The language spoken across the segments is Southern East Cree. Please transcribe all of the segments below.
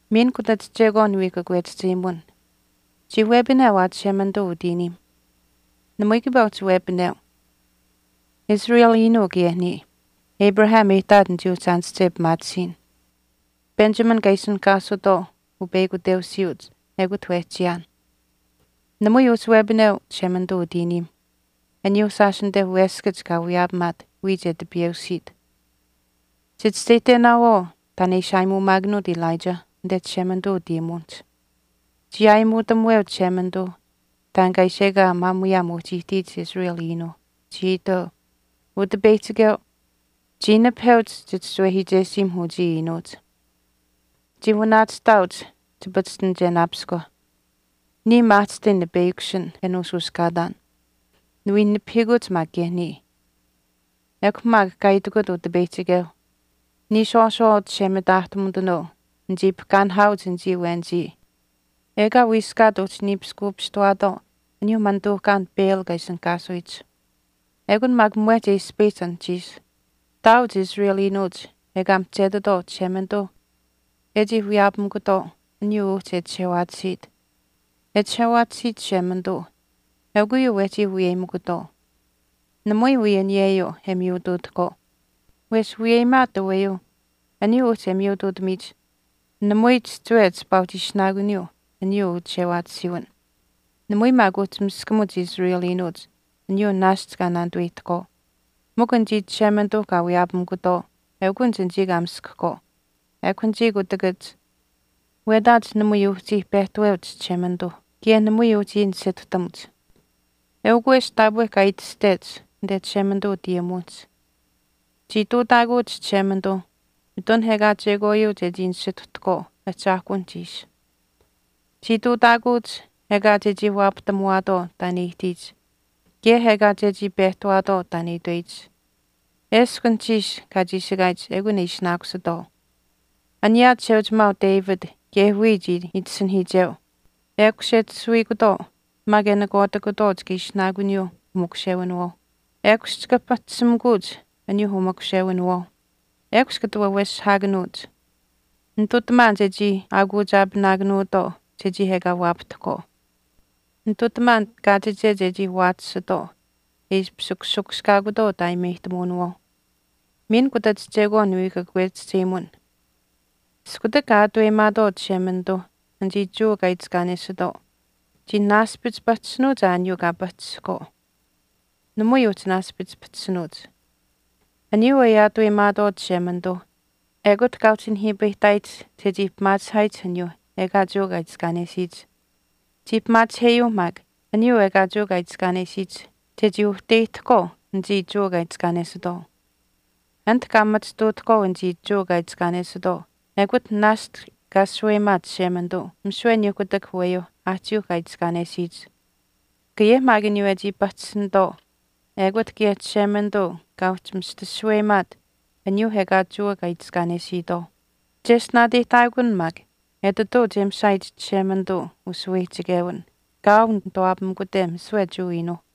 Miin kutach chekwaan niwii kakwechihcheyimun. Chii wepineu aa Chishemanituu utiiniim. Namui kiipaa uhchi wepineu. Israel iinuu kaye niya. Abraham e ihtaat nichii uhchi aanische pimaatisiin. Benjamin kaa ishinihkaasutwaau upeyakuteusiyuuch ekut wehchiyaan. Namui uhchi wepineu Chishemanituu utiiniimh, aniyuuh shaash anite weskach kaa wiyaapamaat wiya chechii tipiyeusiit. Chichischeyihtenaawaau taan e ishi aayimuumaakanuut Elijah anite Chishemanituu utayimuwinihch. Chii aayimuutamuweu Chishemanituuh taan kaa ishi ekaa maamuyaam uhchi ihtiyich Israel iinuuh, chii itweu, Utipeyihchikeu, chii nipaheuch chichischiwehiichesiimh uchii iinuuch. Chii wanaachihtaauch chipachishtinichenaapiskwa. Niya maahchishtai nipeyakushin e nuushuushkaataan. Niwii nipahiikuch maak kaye niya. Ekw maak kaa itikut Utipeyihchikeuh, Niishwaashwaa chishe mitaahtumitanuu nichii pahkaanihaauch anichii awenichii ekaa wiiskaat uhchi niipiskuupistawaatwaau aniyuuh manituuhkaan Baal kaa ishinihkaasuyich. Ekun maak mwehch e ispayihch anuhchiish. Ihtaauch Israel iinuuch ekaa mihchetitwaau Chishemanituuh e chii wiyaapamikutwaau aniyuu uhchi e chishewaatisiit. E chishewaatisiit Chishemanituu eukw uyuu wehchii wiyeyimikutwaau. Namui wii aniyeyuu e miyutuutahkwaau. Wesh wiyeyimaat aweyuu aniyuu uhchi e miyutuutamiyich, namui chihchiwe chipaa uhchi ishinaakuniyuu aniyuu uchishewaatisiiwin. Namui maak uhchi miskamuch anichii Israel iinuuch aniyuu naashch kaa naanituweyihtahkwaau. Mikw anichii Chishemanituuh kaa wiyaapamikutwaau eukunich anichii kaa miskahkwaau. Ekw anichii kutakach wetaach namui uhchii pehtaweuch Chishemanituuh kaye namui uhchii nisituhtamuch. Eukw wesh taapwe kaa itashtech anite Chishemanituu utayimuwinihch, Chii ihtuutaakuuch Chishemanituuh mitun ekaa chekwaayuu chechii nisituhtahkwaau ahchaahkuwinihch ishi. Chii ihtuutaakuuch ekaa chechii waapahtamuwaatwaau taan e ihtiyich kaye ekaa chechii pehtahwaatwaau taan e itweyich. Eshkw anuhchiish kaa chiishikaayich ekun e ishinaakusitwaau. Aniyaa chisheuchimaau David kaye wiya chii itasinahiicheu, Ekush e tasuwiikutwaau maak e nakwaatikutwaau chika ishinaakuniyuuh umakushewinawaauh. Ekush chika pahchishimikuuch aniyuuh umakushewinawaauh. Ekush kata waweshihaakanuuch. Nitutamaan chechii aakuuchaapinaakanuutwaau chechii ekaa waapahtahkwaau. Nitutamaan kaachiche chechii waachisitwaau e ishpish kushikushkaakutwaau utaayimeyihtamuwinawaauh. Miin kutach chekwaan niwii kakwechihchemun. Iskutak kaa aataweyimaatwaau Chishemanituuh anichii Jewa kaa itiskaanesitwaau, chii naaspich pahchishinuuch aa aniyuu kaa pahchishihkwaau. Namui uhchi naaspich pahchishinuuch. Aniyuu e aataweyimaatwaau Chishemanituuh ekut kaa uhchi nihiipayihtaayich chechii pimaachihaayich aniyuuh ekaa Jewa kaa itiskaanesiyich. Chii pimaachiheyuuh maak aniyuu ekaa Jewa kaa itiskaanesiyich chechii uhteyihtahkwaau anichii Jewa kaa itiskaanesitwaau. Anit kaa machituutahkwaau anichii Jewa kaa itiskaanesitwaau ekut naashch kaa shaweyimaat Chishemanituu misiwe aniyuu kutak aweyuuh aahchiiuh kaa itiskaanesiyich. Kaye maak aniyuu e chii pahchishinitwaau ekut kaye Chishemanituu kaa uhchi mista shaweyimaat aniyuuh ekaa Jewa kaa itiskaanesitwaau. Cheshtinaateyihtaakun maak etituu che mishaayich Chishemanituuh ushaweyihchichewin kaau nituwaapamikute misiwe Jewa iinuuh.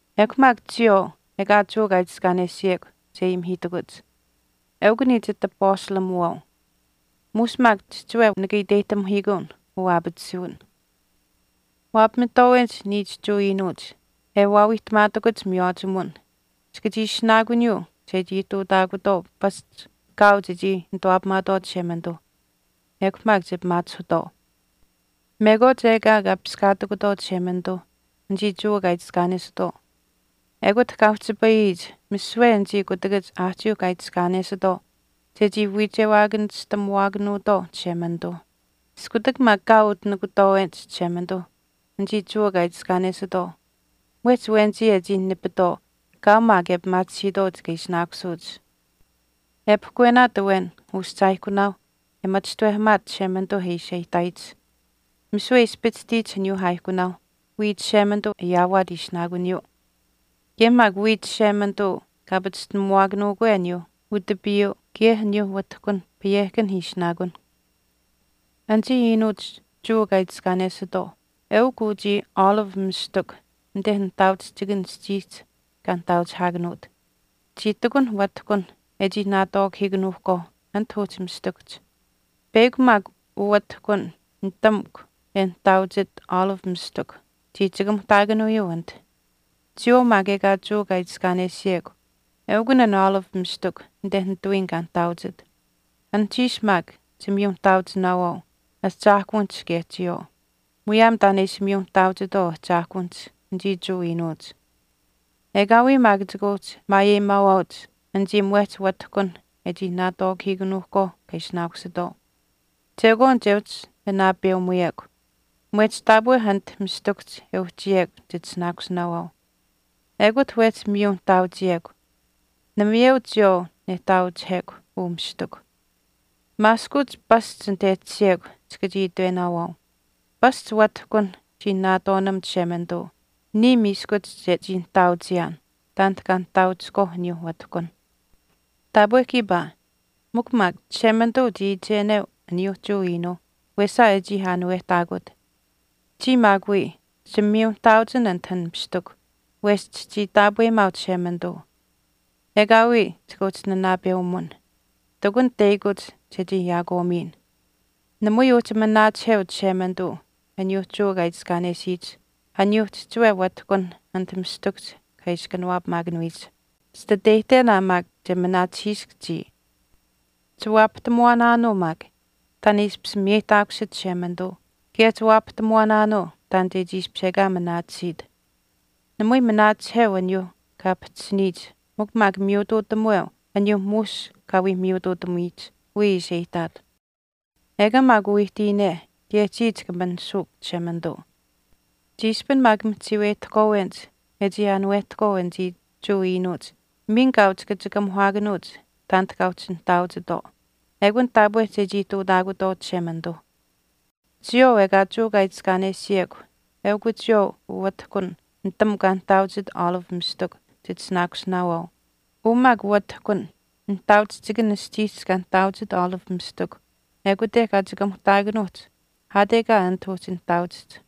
Ekw maak chiyawaau ekaa Jewa kaa itiskaanesiyekw che ayimihiitakuch. Eukw niya chitapastalimuwaau. Muush maak chihchiwe nika iteyihtamihiikuun uu aapatisuwin. Wapamitwaawenich niich Jewa iinuuch e waawiihtamaatakuch miywaachimuwin chika chii ishinaakuniyuu chechii ihtuutaakutwaau pasch kaau chechii nituwaapamaatwaau Chishemanituuh ekw maak che pimaachihutwaau. Mekwaach ekaa kaa piskaatikutwaau Chishemanituuh anichii Jewa kaa itiskaanesitwaau ekut kaa uhchipayiyich misiwe anichii kutakach aahchiiuh kaa itiskaanesitwaau chechii wiichewaakanistamuwaakanuutwaau Chishemanituuh. Iskutak maak kaau utinikutwaawenich Chishemanituuh anichii Jewa kaa itiskaanesitwaau mwehch awenichii e chii nipitwaau kaau maak e pimaatisiitwaau chika ishinaakusuuch. E pahkwenaat awen uschaaihkunaauh e machishtawehamaat Chishemanituu ishi e ihtaayich misiwe e ispichishtiyich aniyuuh aaihkunaau wiya Chishemanituu e ayaawaat ishinaakuniyuu. Kaye maak wiya Chishemanituu kaa pachishtinamuwaakanuukwe aniyuu utapiyuu kaye aniyuuh watihkunh payehkanh ishinaakun. Anichii iinuuch Jewa kaa itiskaanesitwaau eukw uchii olive mistikw anite nihtaauchihchikan aschiihch kaa nihtaauchihaakanuut. Chii ihtakunh watihkunh e chii naatwaakahiikanuuhkwaau anit uhchi mistikuhch. Peyakw maak uwatihkun nitamukw e nihtaauchit olive mistikw chii chikamuhtaakanuuyuu anit. Chiyawaau maak ekaa Jewa kaa itiskaanesiyekw eukun an olive mistikw anite nitawiin kaa nihtaauchit. Anuhchiish maak chimiyu nihtaauchinaawaau ahchaahkuwinihch kaye chiyawaau, muyaam taan e ishi miyu nihtaauchitwaau ahchaahkuwinihch anichii Jewa iinuuch. Ekaawii maak chika uhchi maayeyimaawaauch anichii mwehch wahtihkunh e chii naatwaakahiikanuuhkwaau kaa ishinaakusitwaau. Chekwaan che uhchi wii nanaapeumuyekw. Mwehch taapwe anit mistikuhch e uhchiyekw chitishinaakusinaawaau. Ekute wehchi miyu nihtaauchiyekw. Namayeu chiyawaau nehtaauchihekw uu mistikw. Maaskuuch pasch anit e tashiyekw chika chii itwenaawaau, “Pasch watihkunh chii naatwaanam Chishemanituu niya miiskuch chechii nihtaauchiyaan taanit kaa nihtaauchihkwaau aniyuuh watihkunh.” Taapwe kiipaa. Mikw maak, Chishemanituu chii iicheneu aniyuuh Jewa iinuuh wesa e chii aanuwehtaakut. Chiya maak wii, chimiyunihtaauchin anit an mistikw wesh chichii taapweyimaau Chishemanituu. Ekaawii chika uhchi nanaapeumun. Ihtakun teyakuch chechii yaakwaamiyin. Namui uhchi manaachiheu Chishemanituu aniyuuh Jewa kaa itiskaanesiyich, aniyuuh chihchiwe watihkunh anit mistikuhch kaa ishi kanawaapamaakanuyich. Chititeyihten aa maak che manaachihiisk chiya. Chiwaapahtamuwaanaanuu maak taan e ishpish miyeyihtaakusit Chishemanituu kaye chiwaapahtamuwaanaanuu taan chechii ishpish ekaa manaatisiit. Namui manaachiheu aniyuuh kaa pahchishiniyich mikw maak miyutuutamuweu aniyuu muush kaa wii miyutuutamiyich wiya ishi e ihtaat. Ekaa maak uu ihtiyine kaye chiya chika manishuukw Chishemanituu. Chiishpin maak mihchiiweyihtahkwaawenich e chii aanuwehtahkwaau anichii Jewa iinuuch miin kaau chika chikamuhaakanuuch taanit kaa uhchi nihtaauchitwaau. Ekun taapwe chechii ihtuutaakutwaau Chishemanituuh. Chiyawaau ekaa Jewa kaa itiskaanesiyekw eukw chiyawaau uwatihkun nitamukw kaa nihtaauchit olive mistikw chitishinaakusinaawaau. Uu maak watihkun, nihtaauchihchikan aschiihch kaa nihtaauchit olive mistikw ekute kaa chikamuhtaakanuuhch aat ekaa anit uhchi nihtaauchihch.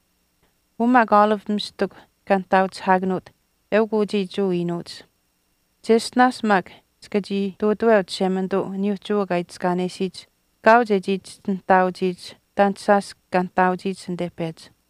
Uu maak olive mistikw kaa nihtaauchihaakanuut eukw uchii Jewa iinuuch. Cheshtinaash maak chika chii ihtuutaweu Chishemanituu aniyuuh Jewa kaa itiskaanesiyich kaau chechii chihchi nihtaauchiyich taanit shaash kaa nihtaauchiyich anite pechi.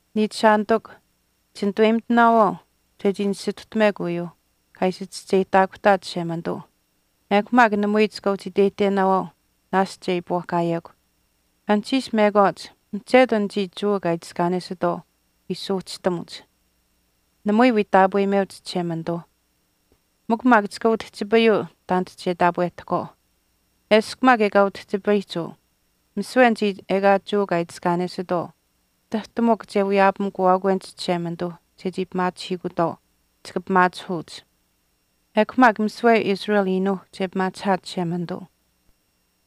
Niichishaanitikw, chinituweyimitinaawaau chechii nisituhtamuwekw uyuu kaa ishi chischeyihtaakuhtaat Chishemanituu ekw maak namui chika uhchi iteyihtenaawaau naashch e iipwaahkaayekw. Anuhchiish mekwaach mihchetu anichii Jewa kaa itiskaanesitwaau wii suuhchitamuch. Namui wii taapweucheyimeuch Chishemanituuh. Mikw maak chika utihchipayuu taanit che taapwehtahkwaau. Eshkw maak ekaa utihchipayihch uu misiwe anichii ekaa Jewa kaa itiskaanesitwaau tahtu mikw che wiyaapamikuwaakwenich Chishemanituuh chechii pimaachihutwaau, chika pimaachihuuch. Ekw maak misiwe Israel iinuuh che pimaachihaat Chishemanituu.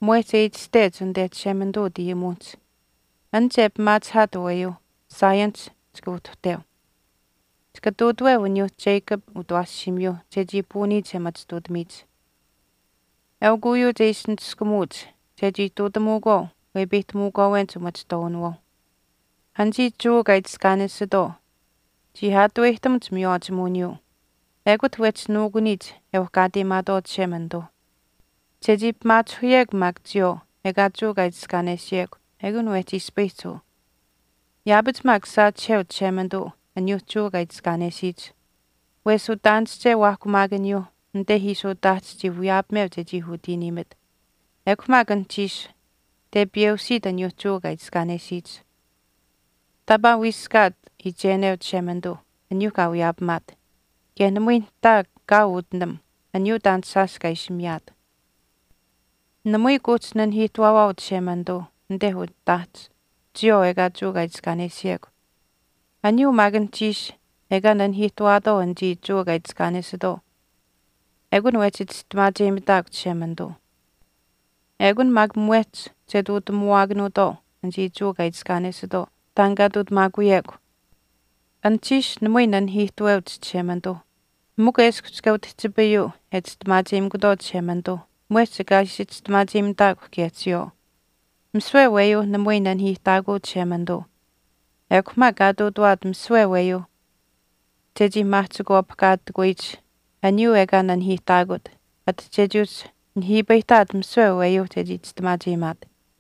Mwehch e itashtech anite Chishemanituu utayimuwinihch, An che pimaachihaat aweyuu, Zionihch chika uhtuhteu. Chika ihtuutaweu aniyuuh Jacob utawaashiimiyuu chechii puuniyich e machituutamiyich. Eukw uyuu che ishi niskumuuch chechii ihtuutamuukwaau wepeyihtamuukwaawenich umachihtwaawinawaauh. Anichii Jewa kaa itiskaanesitwaau chii aataweyihtamuch miywaachimuwiniyuu. Ekut wehchi nuukuniyich e uhkaateyimaatwaau Chishemanituuh. Chechii pimaachihuyekw maak chiyawaau ekaa Jewa kaa itiskaanesiyekw ekun wehchii ispayihch uu. Yaapach maak saachiheu Chishemanituu aniyuuh Jewa kaa itiskaanesiyich. Wesh utaanische waahkumaakaniyuuh anite ishi utaahch chii wiyaapameu chechii utiiniimit. Ekw maak anuhchiish tepiyeusiit aniyuuh Jewa kaa itiskaanesiyich. Taapaa wiiskaat iicheneu Chishemanituu aniyuuh kaa wiyaapamaat. Kaye namui nihtaa kaau utinam aniyuu taan shaash kaa ishi miyaat. Namui kuuhchi nanihiihtuwaawaau Chishemanituu anite utaahch chiyawaau ekaa Jewa kaa itiskaanesiyekw. Aniyuu maak anuhchiish ekaa nanihiihtuwaatwaau anichii Jewa kaa itiskaanesitwaau ekun wehchi chistimaacheyimitaakw Chishemanituu. Ekun maak mwehch che ihtuutamuwaakanuutwaau anichii Jewa kaa itiskaanesitwaau taan kaa ihtuutamaakuyekw. Anuhchiish namui nanihiihtuweuch Chishemanituuh. Mikw eshkw chika utihchipayuu e chistimaacheyimikutwaau Chishemanituuh mwehch kaa ishi chistimaacheyimitaakw kaye chiyawaau. Misiwe aweyuuh namui nanihiihtaakuu Chishemanituu. Ekw maak kaa ihtuutawaat misiwe aweyuuh chechii maahchikwaapihkaatikuyich aniyuu ekaa nanihiihtaakut ati chechii uhchi nihiipayihtaat misiwe aweyuuh chechii chistimaacheyimaat.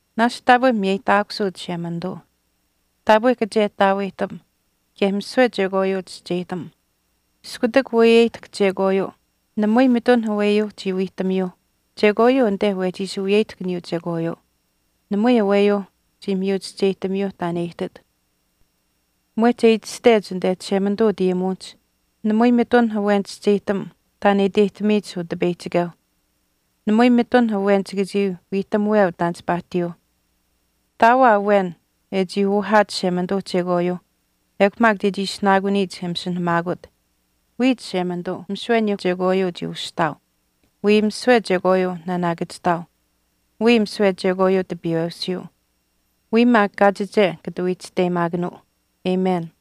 Naashch taapwe miyeyihtaakusuu Chishemanituu. Taapwe kachehtaaweyihtam kaye misiwe chekwaayuu chischeyihtam. Iskutak weyeyihtahk chekwaayuu namui mitun aweyuuh chii wiihtamiyuuh chekwaayuu anite wehchi ishi wiyeyihtahk aniyuu chekwaayuu. Namui aweyuuh chii miyu chischeyihtamiyuuh taan e ihtit. Mwehch e itashtech anite Chishemanituu utayimuwinihch, Namui mitun awen chischeyihtam taan e iteyihtamiyich Utipeyihchikeuh. Namui mitun awen chika chii wiihtamuweu taan chipaa ihtiyuuh. Ihtaau aa awen e chii uhaat Chishemanituu chekwaayuu ekw maak chechii ishinaakuniyich e masinahamaakut. Wiya Chishemanituu misiwe chekwaayuu chii ushihtaau. Wiya misiwe chekwaayuu naanaakachihtaau. Wiya misiwe chekwaayuu tipiyeusiiu. Wiya maak kaachiche kata wii chisteyimaakanuu. Amen.